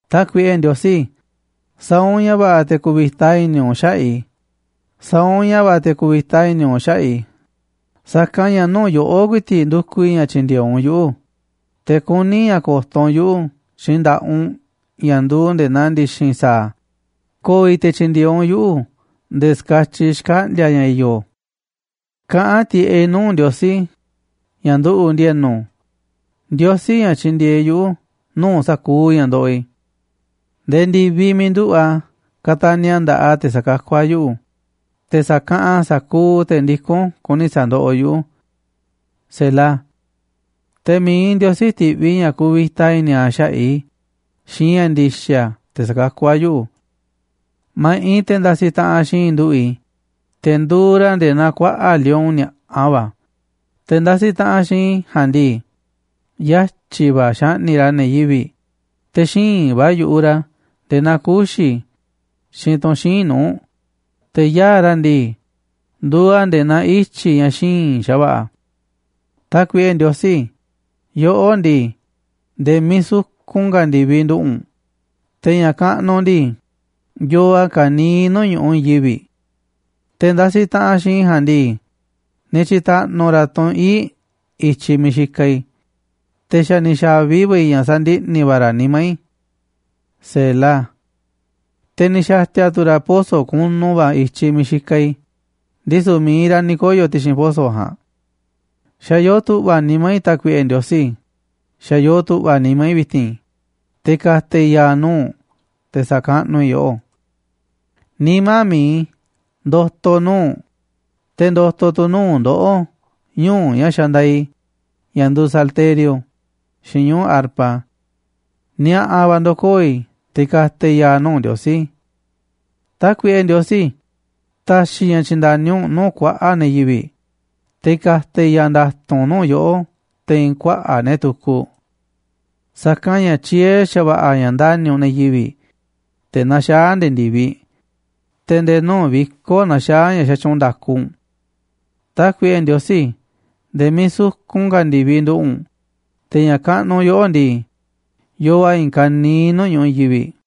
Tákuiꞌe Ndiosí, sa̱a̱ u̱nꞌ ña̱ va̱ꞌa̱ te̱ ku̱vi̱ta i̱ni̱ u̱nꞌ xaꞌa̱ꞌ i̱. Sa̱a̱ u̱nꞌ ña̱ va̱ꞌa̱ te̱ ku̱vi̱ta i̱ni̱ u̱nꞌ xaꞌa̱ꞌ i̱, sa̱kanꞌ ña̱ nuu̱ꞌ yoꞌó ku̱i̱ti̱ꞌ ndukuꞌ i̱ ña̱ tyi̱ndi̱e̱eꞌ u̱nꞌ yuꞌu̱, te̱ kuní i̱ ña̱ ko̱to̱ u̱nꞌ yuꞌu̱ xiinꞌ nda̱ꞌaꞌ u̱nꞌ ña̱ nduuꞌ nde̱e̱ naa ndi̱xi̱n sa̱a̱, ko̱o̱ i̱ te̱ tyi̱ndi̱e̱eꞌ u̱nꞌ yuꞌu̱ nde̱e̱ ska̱tyiꞌ xkaꞌndi̱a̱ ña̱ i̱yo̱. Kaꞌán tiꞌeꞌ i̱ nuu̱ꞌ Ndiosí, ña̱ nduꞌu̱ꞌ ndi̱e̱nu̱, Ndiosí, ña̱ tyindieeꞌ yuꞌu̱ nuu̱ꞌ sa̱kuuꞌ ña̱ ndoꞌoꞌ i̱. Nde̱e̱ ndi̱viꞌ miiꞌ nduꞌu̱ꞌ a̱ ka̱ta̱ni̱ a̱ nda̱ꞌaꞌ a̱ te̱ sa̱kakú a̱ yuꞌu̱, te̱ sa̱kaꞌanꞌ a̱ sa̱kuuꞌ te̱ ndikún kuni sa̱ndoꞌoꞌ yuꞌu̱. Selah Te̱ mi̱iꞌ Ndiosí ti̱ꞌviꞌ ña̱ ku̱vi̱ta i̱ni̱ a̱ xaꞌa̱ꞌ i̱ xiinꞌ ña̱ ndi̱xa̱ te̱ sa̱kakú a̱ yuꞌu̱. Ma̱ꞌiꞌ te̱ ndasiꞌ taꞌanꞌ xiinꞌ i̱ nduꞌu̱ꞌ i̱, te̱ nduuꞌ ra̱ nde̱e̱ naa kuaꞌa̱ꞌ lion ni̱a̱ꞌa va̱, te̱ ndasiꞌ taꞌanꞌ xiinꞌ i̱ ja̱a̱nꞌ ndii, yatyi̱ va̱ xaꞌni̱ꞌ ra̱ ne̱ yivi̱ꞌ, te̱ xíinꞌ va̱ yu̱ꞌuꞌ ra̱ nde̱e̱ naa kuxi̱, xiinꞌ tunꞌ xíinꞌ nuu̱ꞌ, te̱ yaa̱ꞌ ra̱ ndii, nduuꞌ a̱ nde̱e̱ naa ityi̱ ña̱ xíinꞌ xa̱va̱ꞌa̱. Tákuiꞌe Ndiosí, yoꞌó ndii, nde̱e̱ miiꞌ sukun ka̱ ndi̱viꞌ nduꞌu̱ꞌ u̱nꞌ, te̱ ña̱ kaꞌnuꞌ u̱nꞌ ndii, yoo a̱ ka̱niiꞌ nuu̱ꞌ ñu̱ꞌuꞌ i̱i̱n yivi̱ꞌ. Te̱ ndasiꞌ taꞌanꞌ xiinꞌ i̱ ja̱a̱nꞌ ndii, ni̱ tyi̱ta̱ꞌnu̱ ra̱ tunꞌ ii̱ꞌ i̱tyiꞌ miiꞌ xikaꞌ i̱, te̱ xa̱ ni̱ xa̱vi va̱ i̱ ña̱ sandiꞌni̱ va̱ ra̱ nimá i̱. Selah Te̱ ni̱ xa̱ti̱a̱ tu̱ ra̱ poso̱ kunu va̱ i̱tyiꞌ miiꞌ xikaꞌ i̱, ndisu̱ mi̱iꞌ ra̱ ni̱ koyo̱ ti̱xi̱n poso̱ ja̱a̱nꞌ. Xa̱ yoo tu̱ꞌva̱ nimá i̱, Tákuiꞌe Ndiosí, xa̱ yoo tu̱ꞌva̱ nimá i̱ vi̱ti̱n, te̱ ka̱ta̱ i̱ ya̱a̱ nuu̱ꞌ u̱nꞌ, te̱ sa̱kaꞌnuꞌ i̱ yoꞌó. Nimá mi̱iꞌ i̱, ndo̱to̱ nuu̱ꞌ u̱nꞌ, te̱ ndo̱to̱ tu̱ nuu̱ꞌ ndoꞌó ñuu̱ꞌ ña̱ xandaaꞌ i̱, ña̱ nduuꞌ salterio xiinꞌ ñuu̱ꞌ arpa. Ni̱a̱ꞌa̱ va̱ ndo̱koo̱ i̱ te̱ ka̱ta̱ i̱ ya̱a̱ nuu̱ꞌ Ndiosí. Tákuiꞌe Ndiosí, ta̱xi̱ i̱ ña̱ tyi̱nda̱ni u̱nꞌ nuu̱ꞌ kuaꞌa̱ꞌ ne̱ yivi̱ꞌ, te̱ ka̱ta̱ i̱ ya̱a̱ nda̱tu̱nꞌ nuu̱ꞌ yoꞌó te̱i̱n kuaꞌa̱ꞌ ne̱ tukuꞌ. Sa̱kanꞌ ña̱ tyiee̱ xa̱va̱ꞌa̱ ña̱ ndani̱ u̱nꞌ ne̱ yivi̱ꞌ, te̱ naxaá a̱ nde̱e̱ ndi̱viꞌ, te̱ nde̱e̱ nuu̱ꞌ viko̱ꞌ naxaá ña̱ xatyuunꞌ nda̱ku u̱nꞌ. Tákuiꞌe Ndiosí, nde̱e̱ miiꞌ sukun ka̱ ndi̱viꞌ nduꞌu̱ꞌ u̱nꞌ, te̱ ña̱ kaꞌnuꞌ yoꞌó ndii, yoo a̱ i̱i̱n ka̱niiꞌ nuu̱ꞌ ñu̱ꞌuꞌ i̱i̱n yivi̱ꞌ.